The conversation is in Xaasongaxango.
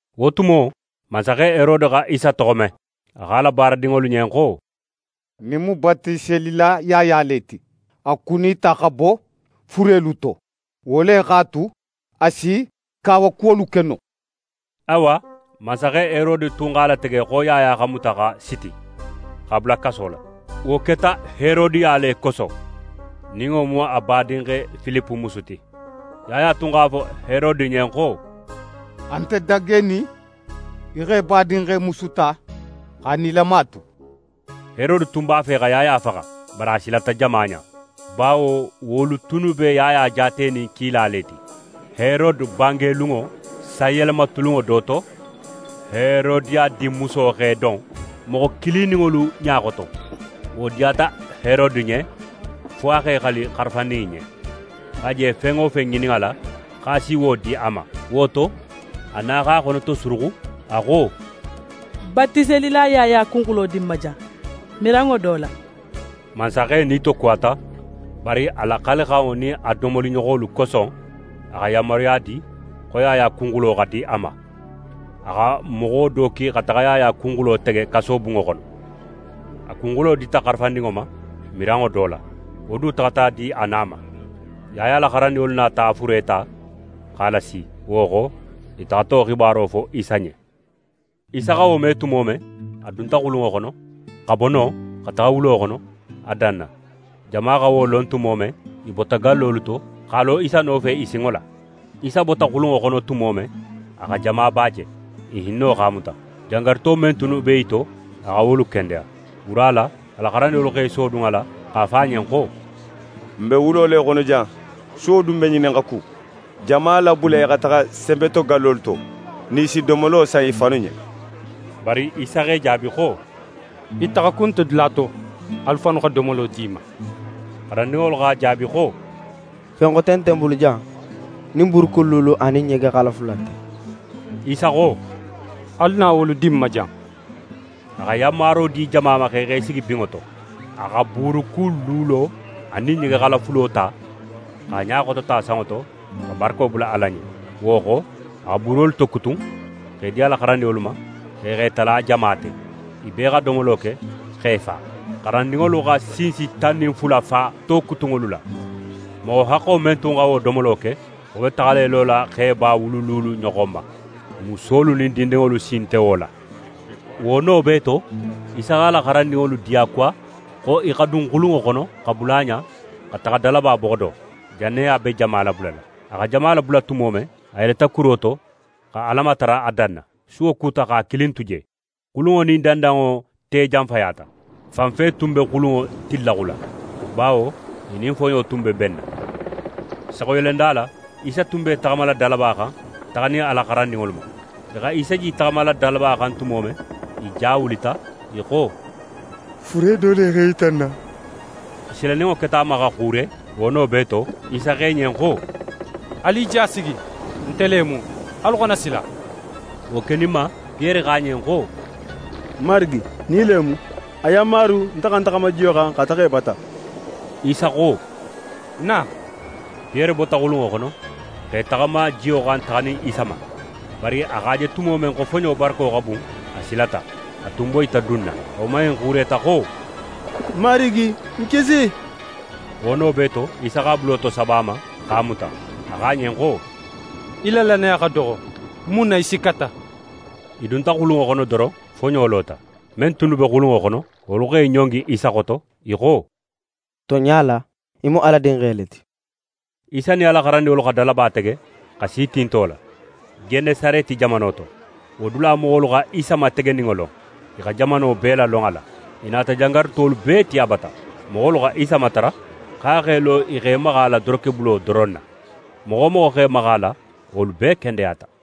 Wo tumo, mansaxe Herode xa Isa toxo me. A xo a la baaradinŋolu ɲen xo: «Ɲin mu Batiselila Yaya le ti. A kunita xa bo furelu to. Wo le x'a tu, a si kawakuwolu ke no.» Awa, mansaxe Herode tun x'a latege xo Yaya xa muta xa siti, x'a bula kaso la. Wo keta Herodiya le koso, nin wo mu a badinxe Filipe musu ti. Yaya tun x'a fo Herode ɲen xo: «A nte dagenin í xa í badinxe musu ta x'a nilama tu.» Herode tun b'a fe xa Yaya faxa, bari a silata jama ɲa; bawo wolu tunnu be Yaya jaatenin kila le ti. Herode bange lunŋo sanyelema tulunŋo do to, Herodiya dinmuso x'é don moxo kilininŋolu ɲa xoto. Wo diyata Herode ɲen fo a x'é xali xarafandin in ɲen, xo a je fen wo fen ŋinin a la, x'a si wo di a ma. Wo to, a na x'a xonotosuruxu, a xo: «Batiselila Yaya kunxulo di ń ma jan, miranŋo do la.» Mansaxe nitokuwata, bari a la xalixanŋo nin a domoliɲoxolu koso, a xa yanmaruya di xo Yaya kunxulo xa di a ma. A xa moxo do ki xa taxa Yaya kunxulo tege kasobunŋo xono. A kunxulo dita xarafandinŋo ma, miranŋo do la. Wo du taxata a di a na ma. Yaya la xarandinŋolu nata a fure ta, x'a lasi. Wo xo, i taxata wo xibaro fo Isa ɲen. Isa xa wo me tumo men, a dunta xulunŋo xono, xa bo non xa taxa wulo xono, a danna. Jama xa wo lon tumo men, i bota gallolu to x'a lo Isa nofe i sinŋo la. Isa bota xulunŋo xono tumo men, a xa jamaba je. I hinno x'a muta. Jangaruto men tunnu be i to, a xa wolu kendeya. Wura la, a la xarandinŋolu x'e sodun a la x'a fo a ɲen xo: «N be wulo le xono jan, suwo dun be ŋinin xa ku. Jama labula i xa taxa senbetogallolu to, nin i si domolo san i fannu ɲen.» Bari Isa x'e jaabi xo: «I taxakun nte dula to, alu fannu xa domolo di i ma!» Xarandinŋolu x'a jaabi xo: «Fen xote nte n bulu jan nin buurukun luulu anin ɲegexala fula nte.» Isa xo: «Alu na wolu di ń ma jan.» A xa yanmaro di jama ma xo i x'e sigi binŋo to. A xa buurukun luulo anin ɲegexala fulo ta, x'a ɲa xotota sanŋo to, xa barako bula Ala ɲen. Wo xo, a xa buurolu tokutun, x'e di a la xarandinŋolu ma, xo i x'e tala jama te. I bee xa domolo ke x'e fa. Xarandinŋolu xa sinsi tan nin fula fa tokutunŋolu la. Moxo haxxo men tun xa wo domolo ke, wo be taxala í lola xeba wulu luulu ɲoxon ma, musolu nin dindinŋolu sin nte wo la. Wo no bee to, Isa x'a la xarandinŋolu diyakuwa xo i xa dun xulunŋo xono, xa bula a ɲa, xa taxa dalaba boxo do, jannin a be jama labulala. A xa jama labula tumo men, a yeleta kuro to, xa Ala matara a danna. Suwo kuta x'a kilin tu je. Xulunŋo nin dandanŋo te janfayata. Fanfe tun be xulunŋo tinlaxula; bawo i nin foɲo tun be benna. Saxuyelenda la, Isa tun be í taxamala dalaba xan, taxanin a la xarandinŋolu ma. I xa Isa je í taxamala dalaba xan tumo men, i ja wulita, i xo: «Fure do le x'é yita n na.» I silaninŋo keta a ma xa xuure. Wo no bee to, Isa xo i ɲen xo: «Alu i ja sigi, nte le mu. Alu xana sila!» Wo keninma, Piyere xo a ɲen xo: «Marigi, nin í le mu, a yanmaru nte xa ń taxama jiyo xan xa taxa í bata.» Isa xo: «Na!» Piyere bota xulunŋo xono x'é taxama jiyo xan taxanin Isa ma. Bari a x'a je tumo men xo foɲo barako xa bun, a silata. A tun boyita dunna, a woman in xuureta xo: «Marigi, ń kisi!» Wo no bee to, Isa x'a bulo tosaba a ma, x'a muta. A xo a ɲen xo: «Í la lannaya xa doxo, mun na í sikkata?» I dunta xulunŋo xono doron, foɲo lota. Men tunnu be xulunŋo xono, wolu x'e ɲongi Isa xoto, i xo: «Tonɲa la, í mu Ala Dinxe le ti.» Isa nin a la xarandinŋolu xa dalaba tege, xa si tinto la, Genesareti jamano to. Wo dula moxolu xa Isa mategeninŋo lon, i xa jamano bee lalon a la. I nata jangarutolu bee ti a bata. Moxolu xa Isa matara xo a x'é lo i x'e maxa a la dorokebulo doron na. Moxo wo moxo x'é maxa a la, wolu bee kendeyata.